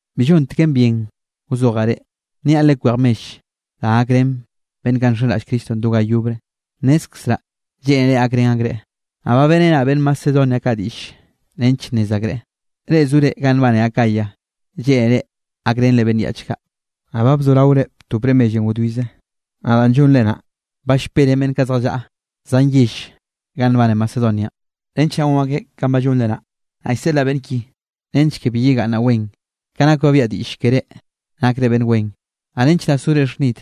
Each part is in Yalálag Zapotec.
Bi llonteken bien wzojaꞌ reꞌ, nniaꞌ lekwej mell da gakrén beꞌnn kaꞌ nxenraꞌll Cristonꞌ do ga yobre. Nnezkzraꞌ lleꞌnere gakrén akreꞌ. Naꞌ ba beꞌrenaꞌ beꞌnn Macedonia kaꞌ diꞌll nench nnez akreꞌ, reꞌ zore ganꞌ nbane Acayanꞌ lleꞌnere gakrenre beꞌnn yaꞌch kaꞌ, naꞌ ba bzoraore btopre mellenꞌ wdwize. Naꞌ da llonre naꞌ ba llperen beꞌnn kaꞌ zjallaꞌa zan yell ganꞌ nbane Macedonianꞌ, nench naꞌ gon akeꞌ kanꞌ ba llonre naꞌ. Naꞌ llseꞌlaꞌ beꞌnn ki nench ke bi yegaꞌnnaꞌ wen, ka nak ba biaꞌa diꞌll keré nakre beꞌnn wen, naꞌ nench naꞌ sore xhnid.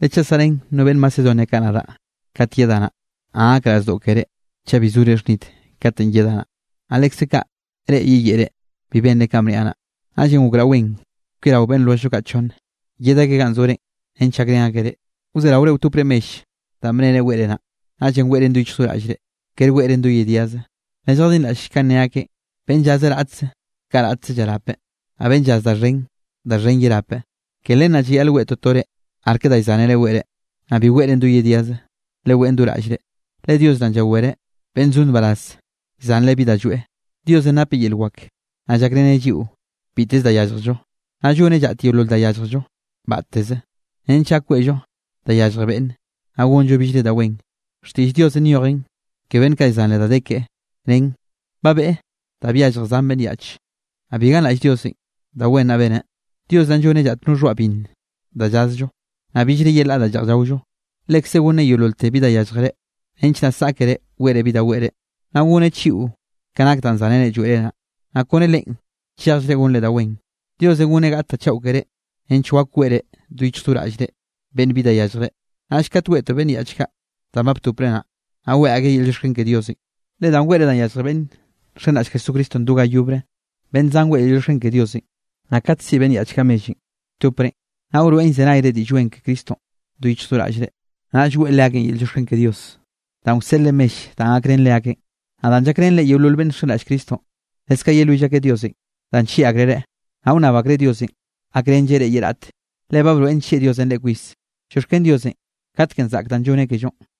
Le chaꞌ saꞌrén no beꞌnn Macedonia kaꞌ nadaꞌ kat yedaꞌ naꞌ, naꞌ gakraꞌ zdoꞌ keré chaꞌ bi sore xhnid katenꞌ yedaꞌ naꞌ, naꞌ lekze kaꞌ reꞌ yeyeꞌre bi benre kanꞌ bniaꞌ naꞌ. Naꞌllenꞌ gokraꞌ wen kwiarao beꞌnn lwelljllo kaꞌ chonneꞌ, yed akeꞌ ganꞌ zore nench gakrén akeꞌ reꞌ, wzeraore wtopre mell danꞌ bnere weꞌre naꞌ. Naꞌllenꞌ weꞌren do yichj do raꞌllre, kere weꞌren do yediaze. Lelljadinraꞌll kanꞌ ne akeꞌ: Beꞌnn llaze raꞌtze, kaꞌ raꞌtze llarapeꞌ, naꞌ beꞌnn llaz da xhen, da xhen yerapeꞌ. Ke len naꞌ llayaꞌl weꞌe totore arke da llzánere weꞌre, naꞌ bi weꞌren do yediaze, leweꞌn do raꞌllre, le Dios naꞌn llawereꞌ beꞌnn zo nbaraz llzanreꞌ bi da lloeꞌ. Diosenꞌ napeꞌ yel wak, naꞌ llakreneꞌ lliꞌo biteze da yálljello. Naꞌ lloneꞌ llaꞌt yeolol da yálljello batteze, nench gak weꞌllo da yallje beꞌnne, naꞌ gonllo billre da wen. Xtiꞌll Diosenꞌ nyojen ke beꞌnn llzanreꞌ da de keꞌe nen: Ba beꞌe da byallje zan beꞌnn yaꞌch. Naꞌ bi ganraꞌll Diosenꞌ da wen naꞌ beneꞌ. Dios naꞌn lloneꞌ llaꞌt no xhoaꞌ binn da llazllo, naꞌ billre yelaꞌ da lleꞌj llaollo. Lekze gonneꞌ yeololte bi da yálljere, nench naꞌ saꞌkere weꞌre bi da weꞌre, naꞌ goneꞌ chiꞌo ka nak danꞌ zánere lloeꞌre naꞌ, naꞌ kone Leꞌen chejllre gonre da wen. Diosenꞌ goneꞌ gaꞌt da chaꞌo keré nench wak weꞌre do yichj do raꞌllre beꞌnn bi da llyalljreꞌ. Naꞌll kat weꞌtoꞌ beꞌnn yaꞌch kaꞌ danꞌ ba btopre naꞌ, naꞌ weꞌe akeꞌ yel llioxken ke Diosenꞌ. Le danꞌ weꞌre da yallje beꞌnn nxenraꞌll Jesucristonꞌ do ga yobre, beꞌnn zan weꞌe yel llioxken ke Diosenꞌ. Naꞌ kate siꞌi beꞌnn yaꞌch kaꞌ mellenꞌ lltoprenꞌ, naꞌ wroeꞌn llzenayre Diꞌll Wen ke Cristonꞌ do yichj do raꞌllre. Naꞌll weꞌe leakeꞌn yel llioxken ke Diosenꞌ danꞌ wseꞌlre mell danꞌ gakrén leakeꞌn, naꞌ danꞌ llakrenre yeolol beꞌnn nxenraꞌll Cristonꞌ. Leskaꞌ yelwill akeꞌ Diosenꞌ danꞌ nllieꞌ akreꞌ reꞌ, naꞌ wnnab akreꞌ Dios gakrenlleꞌ reꞌ ye raꞌte, le ba broeꞌn nllieꞌ Diosenꞌ reꞌ kwis. Llioxken Diosenꞌ, katekenꞌ zaꞌk danꞌ lloneꞌ kellonꞌ.